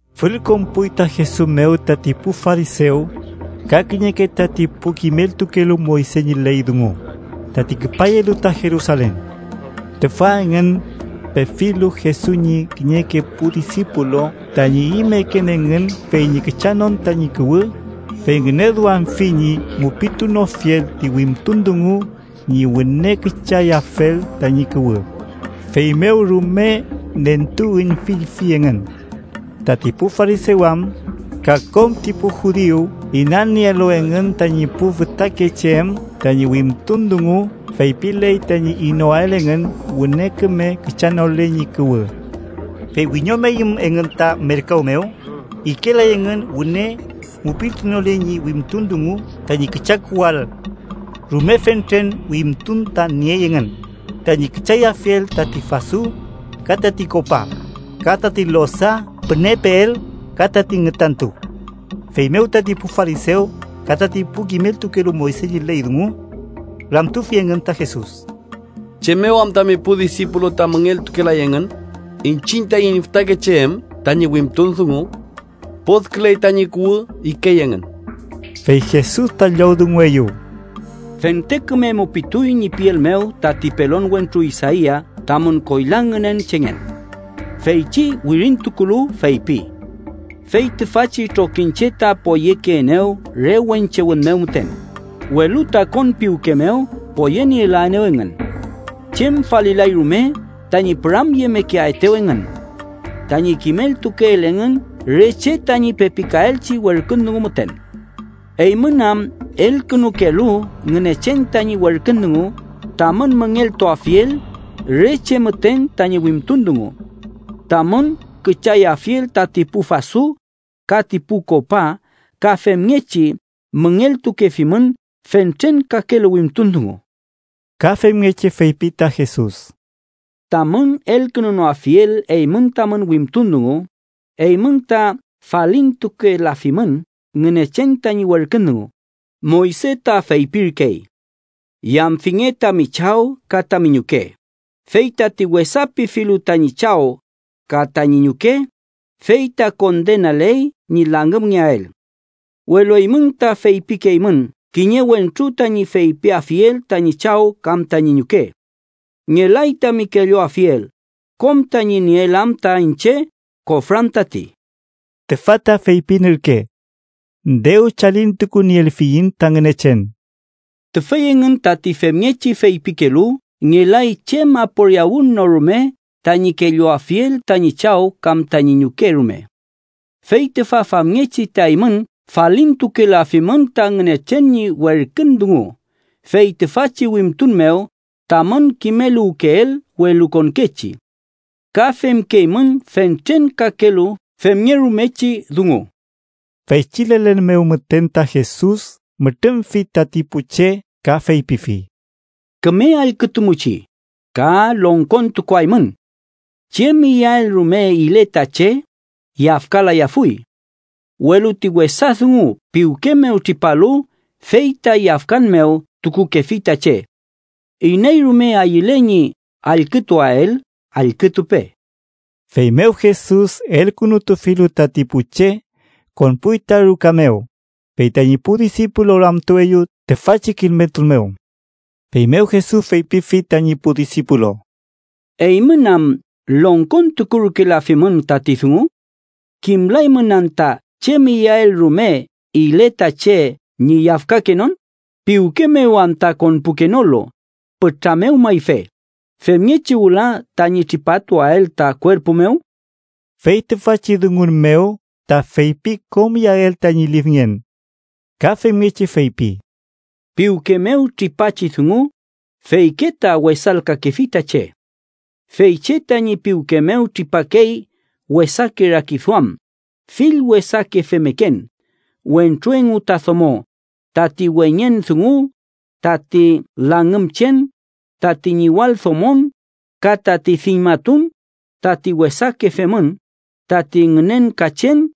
Fülkonpuy ta Jesus mew tati pu farisew, ka kiñeke tati pu kimeltukelu Moyse ñi ley dungu tati küpayelu ta Jerusalen. Tüfa engün, pefilu Jesus ñi kiñeke pu disipulu tañi imeken engün fey ñi küchanon tañi kuwü, fey ngüneduamfi ñi mupitunofiel ti wimtun dungu ñi wüne küchayafel tañi kuwü, feymew rume nentuüñfilfi engün. (Tati pu farisew am, ka kom ti pu Judiu inanielu engün tañi pu fütakeche em tañi wimtun dungu feypiley tañi inoael engün wüne küme küchanole ñi kuwü. Fey wiñomeyüm engün ta merkaw mew, ikelay engün wüne mupitunole ñi wimtun dungu tañi küchakuwüael. Rume fentren wimtun ta niey engün, tañi küchayafiel tati fasu, ka tati kopa, ka tati losa pünepeel ka ti ngütantu.) Feymew, tati pu farisew ka tati pu kimeltukelu Moyse ñi ley dungu, ramtufi engün ta Jesus: —¿Chem mew am tami pu disipulu ta müngeltukelay engün iñchiñ taiñ fütakeche em tañi wimtun dungu? Podkülen tañi kuwü ikey engün. Fey Jesus ta llowdungueyew: —Fente küme mupituy ñi piel mew tati pelon wentru Isaia tamün koyla ngünen chengen. Feychi wirintukulu feypi: ‘Fey tüfachi trokiñche ta poyekeenew re wenche wün mew müten, welu ta konpiwke mew poyenielaenew engün. Chem falilay rume tañi püramyemekeaetew engün: tañi kimeltukeel engün re che tañi pepikaelchi werkün dungu müten.’ Eymün am elkünukelu Ngünechen tañi werkün dungu tamün müngeltuafiel re che müten tañi wimtun dungu: tamün küchayafiel tati pu fasu, ka ti pu kopa, ka femngechi müngeltukefimün fentren kakelu wimtun dungu. Ka femngechi feypi ta Jesus: —Tamün elkünunoafiel eymün tamün wimtun dungu, eymün ta falintukelafimün Ngünechen tañi werkün dungu Moyse ta feypirkey: ‘Yamfinge tami chaw ka tami ñuke’, fey ‘Tati wesapifilu tañi chaw ka tañi ñuke, fey ta kondenaley ñi langümngeael.’ Welu eymün ta feypikeymün kiñe wentru tañi feypiafiel tañi chaw kam tañi ñuke: ‘Ngelay tami kelluafiel, kom tañi nieel am ta iñche korfan tati’ (tüfa ta feypin ürke: “dew chalintukunielfiñ ta Ngünechen”). Tüfey engün tati femngechi feypikelu ngelay chem aporiawün no rume tañi kelluafiel tañi chaw kam tañi ñuke rume. Fey tüfa famngechi ta eymün falintukelafimün ta Ngünechen ñi werkün dungu fey tüfachi wimtun mew tamün kimeluwkeel welukonkechi. Ka femkeymün fentren kakelu femngerumechi dungu. Feychi lelen mew müten ta Jesus mütrümfi tati pu che ka feypifi: —Küme allkütumuchi, ka longkontukuaymün: Chem iyael rume ile ta che, yafkalayafuy. Welu ti wesa dungu piwke mew tripalu, fey ta yafkan mew tukukefi ta che. Iney rume ayüle ñi allkütuael, allkütupe. Feymew Jesus elkünutufilu tati pu che, konpuy ta ruka mew, fey tañi pu disipulu ramtueyew tüfachi kimeltun mew. Feymew Jesus feypifi tañi pu disipulu: —¿Eymün am longkontukurkelafimün tati dungu? ¿Kimlaymün anta chem iyael rume ile ta che ñi yafkakenon, piwke mew am ta konpukenolu, pütra mew mayfe, femngechi wüla tañi tripatuael ta kuerpu mew? (Fey tüfachi dungun mew ta feypi kom iyael tañi lifngen.) Ka femngechi feypi: —Piwke mew tripachi dungu, feyke ta wesalkakefi ta che. Fey che tañi piwke mew tripakey wesake rakiduam, fill wesake femmeken wentru engu ta domo, tati weñen dungu, tati langümchen, tati ñiwaldomon, ka tati diñmatun, tati wesake femün, tati ngünenkachen,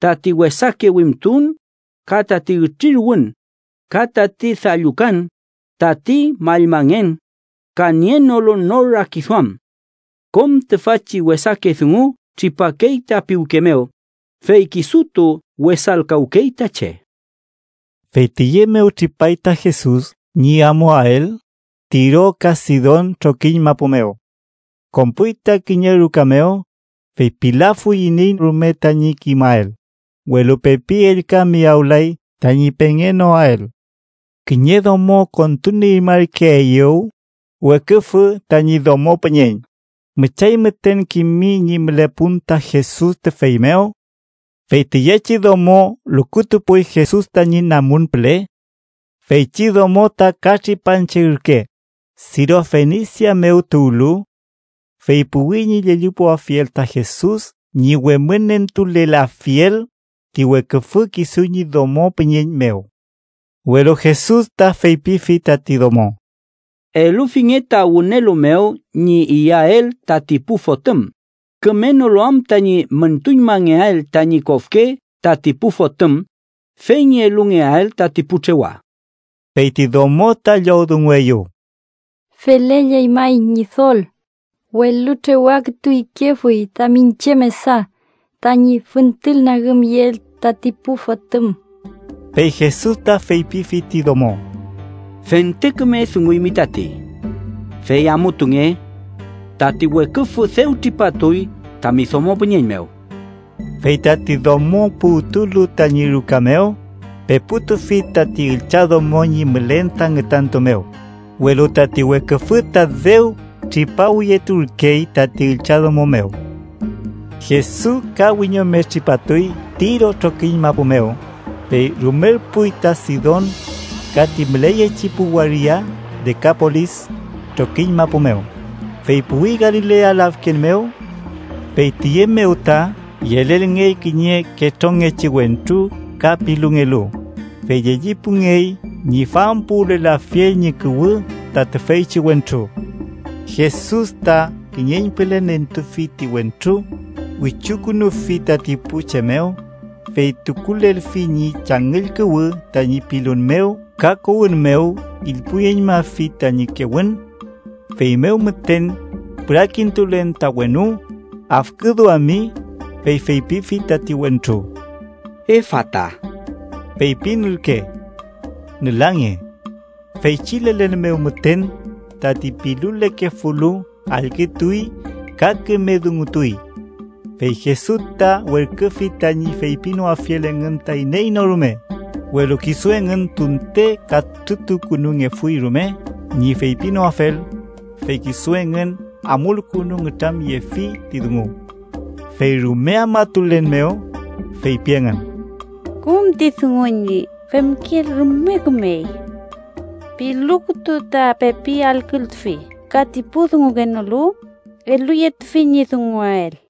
tati wesake wimtun, ka tati ütriruwün, ka tati dallukan, tati mallmangen ka nienolu nor rakiduam. Kom tüfachi wesake dungu tripakey ta piwke mew, fey kisutu wesalkawkey ta che. Fey tiye mew tripay ta Jesus ñi amuael Tiro ka Sidon trokiñ mapu mew. Konpuy ta kiñe ruka mew, fey pilafuy iney rume tañi kimael, welu pepi ellka miyawlay tañi pengenoael. Kiñe domo kontunieñmarkeeyew weküfü tañi domo püñeñ, müchay müten kimi ñi mülepun ta Jesus tüfey mew. Fey tiyechi domo lukutupuy Jesus tañi namun püle. Feychi domo ta katripanche ürke, Sirofenisia mew tuwlu. Fey puwi ñi llellipuafiel ta Jesus ñi wemünentulelafiel ti weküfü kisu ñi domo püñeñ mew. Welu Jesus ta feypifi tati domo: —Elufinge ta wünelu mew ñi iyael tati pu fotüm, kümenolu am tañi müntuñmangeael tañi kofke tati pu fotüm, fey ñi elungeael tati pu trewa. Fey ti domo ta llowdungueyew: —Felelley may, Ñidol, welu trewa kütu ikefuy ta miñche mesa tañi füntülnagümyeel tati pu fotüm. Fey Jesus ta feypifi ti domo: —Fente küme dunguymi tati. Fey amutunge. Tati weküfü dew tripatuy tami domo püñeñ mew. Fey tati domo puwtulu tañi ruka mew, peputufi tati üllchadomo ñi mülen ta ngütantu mew, welu tati weküfü ta dew tripawiyeturkey tati üllchadomo mew. Jesus ka wiñome tripatuy Tiro trokiñ mapu mew, fey rumerpuy ta Sidon ka ti müleyechi pu waria Dekapolis trokiñ mapu mew, fey puwi Galilea lafken mew. Fey tiye mew ta yelelngey kiñe ketrongechi wentru ka pilungelu, fey llellipungey ñi fampuwülelafiel ñi kuwü ta tüfeychi wentru. Jesus ta kiñeñpüle nentufi ti wentru, wichukünufi tati pu che mew, fey tukulelfi ñi changüll kuwü tañi pilun mew ka kowün mew ilpuyüñmafi tañi kewün. Feymew müten, pürakintulen ta wenu, afküduami, fey feypifi tati wentru: “¡Efata!” (feypin ürke: “¡Nülange!”). Feychi lelen mew müten, tati pilulekefulu allkütuy ka küme dungutuy. Fey Jesus ta werküfi tañi feypinoafiel engün ta iney no rume, welu kisu engün tunte katrütukünungefuy rume ñi feypinoafel, fey kisu engün amulkünu nütramyeniefi ti dungu. Fey rume afmatulen mew, feypi engün: “Kom ti dungu ñi femkeel rume kümey. ¡Pilu kütu ta pepi allkültufi ka ti pu dungukenolu, eluyetufi ñi dunguael!”